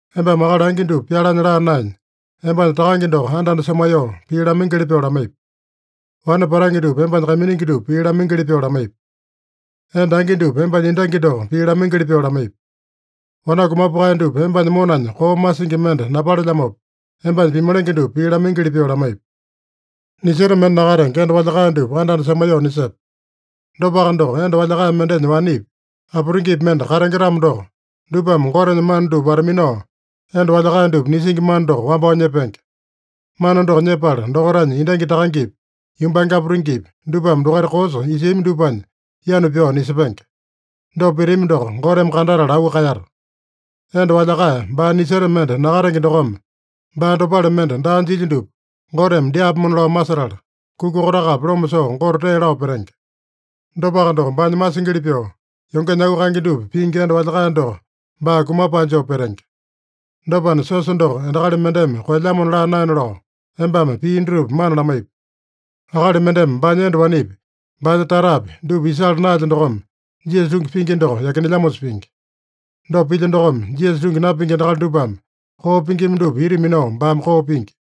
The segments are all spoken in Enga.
Embame akali angi dupa pyalanya laa naenya, embanya takange doko anda-anda semaiyoo, pii lamaingili pyoo lamaipi. Wane patange dupa embanya kaiminingi dupa pii lamaingili pyoo lamaipi. Enda angi dupa embanya endangi doko pii lamaingili pyoo lamaipi. Wanaku mapukae dupa embanya monanya koo masingi mende napalelyamopa, embanya pimalenge dupa pii lamaingili pyoo lamaipi. Niseta mende nakatenge enda walyakae dupa anda-anda semaiyoo nisepe. Dopaka doko, enda walyakae mendenya wanepi, aputingipi mende katenge-tamo doko, dupame Gotenya mana dupa wata-minao, enda walyakae dupa nisingi mana doko wambao nyepenge. Mana doko nyepala dokaitanya endangi takangepi, yumbange aputingipi, dupame dokaita koosa isiami dupanya yanu pyao nisepenge. Dopa pitami doko Goteme kandatala auu kaeyata. Enda walyakae, baa niseta mende nakatenge dokome baa dopale mende daa jilya dupa Goteme dyaapomona lao masetala, kuka kotakapi loma soo Gote tee lao petenge. Dopaka doko, baanya masingili pyoo, yongenya auu kaenge dupa pingi enda walyakae doko baa kumapae joo petenge. Dopana, siosa doko endakali mendeme koelyamona laa naena lao, embame pii dutupa mana lamaipi. Akali mendeme baanya enda wanepi, baanya tatapi, dupa isala naelya dokome, Jisasa tungi pingi doko yakinelyamosa pingi. Dopa pilya dokome, Jisasa tungi napingi endakali dupame koo pingima dupa ita minao baame koo pingi.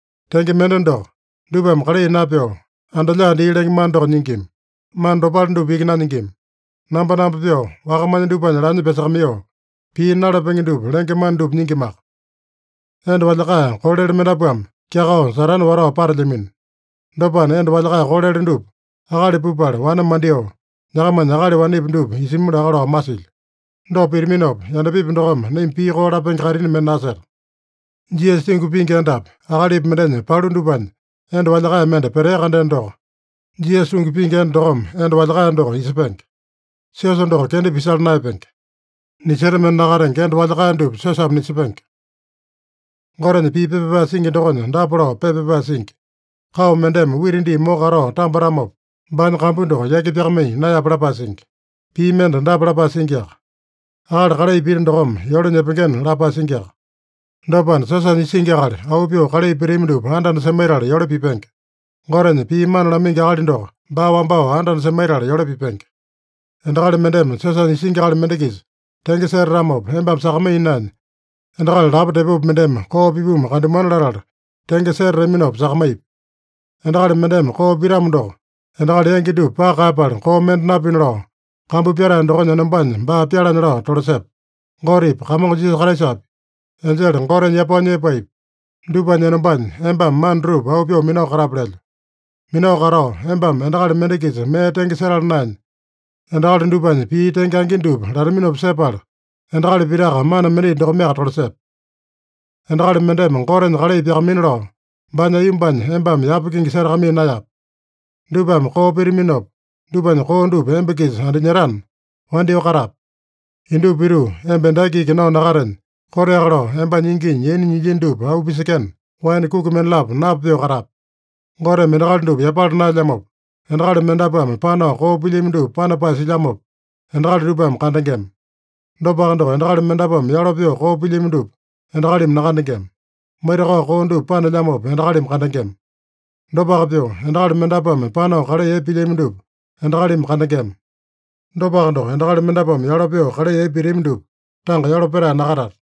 Tenge mende doko, dupame kalai napyoo, anda-lyaa dii lenge mana doko nyingima. Mana dopale dupa iki nanyingima. Nambonambo pyoo, wakamanya dupanya laanya pyasakamaiyoo, pii nalapenge dupa lenge mana dupa nyingimaka. Enda walyakae kolele mendapuame kyakao Satane watao patelyamino. Dopana, enda walyakae kolele dupa akali pupala, wane mandyoo, nyakamanya akali wanepi dupa isimi laka lao masilyo. Dopa pitaminopa, yandapipi dokome naima pii koo lapenge kaitini mende naseta. Jisasa tungi pingi endapi, akalipi mendenya palu dupanya enda walyakae mende petea-kandeno doko, Jisasa tungi pingi enda dokome enda walyakae doko isepenge. Siosa doko kenda pisala naeyapenge. Niseta mende nakatenge enda walyakae dupa siosame nisepenge. Gotenya pii pepa pyapae singi dokonya dapa lao pepa pyapae singi: “Kao mendeme wita dii moko katao tambatamopa, baanya kambu doko yaki pyakamaiya naeyape” lapae singi. Pii mende dapa lapae singiaka: “Akali kalai pita dokome yole nyepengena” lapae singiaka. Dopana, siosanya isingi akali, auu pyoo kalai pitami dupa anda-anda semaitala yole pipenge. Gotenya pii mana lamaingi akali doko, baa wambao anda-anda semaitala yole pipenge. Endakali mendeme siosanya isingi akali mende-kisa tenge setatamopa embame sakamaiya naenya, endakali lapo tepopi mendeme koo pipumu kandamuana latala tenge setataminopa sakamaipi. Endakali mendeme koo pitamo doko, endakali yangi dupa paka kaeyapala koo mende napina lao, kambu pyatae dokonya enombanya baa pyalanya lao tolasepe. Gotepi, Kamongo Jisasa Kraisapi, enjele Goteme yapao nyepaepi, dupanya enombanya, embame mana dutupa auu pyoo minao katape lelyo. Minao katao, embame endakali mende-kisa mee tenge setala naenya, endakali dupanya pii tenge angi dupa lataminopa sepala, endakali pitaka mana mendai dokomeaka tolasepe. Endakali mendeme Gotenya kalai pyakamaina lao, baanya aiyombanya embame yapa kingi setakamaiya naeyape. Dupame koo pitaminopa, dupanya koo dupa emba-kisa andinyetana, wandyoo katape. (Indupa pituu, emba endaki iki nao nakatenya, koteaka lao embanya inginya yaina nyilyino dupa auu pisekena, waene kuki mendalapo napa pyoo katape.) Goteme endakali dupa yapala naelyamopa, endakali mendapuame panao koo pilyami dupa panapae silyamopa, endakali dupame kandengema. Dopaka doko, endakali mendapuame yalo pyoo koo pilyami dupa endakalimi nakandengema. Maitakao koo dupa panelyamopa endakalimi kandengema. Dopaka pyoo, endakali mendapuame panao kalai epe pilyami dupa endakalimi kandengema. Dopaka doko, endakali mendapuame yalo pyoo kalai epe pitami dupa tanga yalo petae nakatata.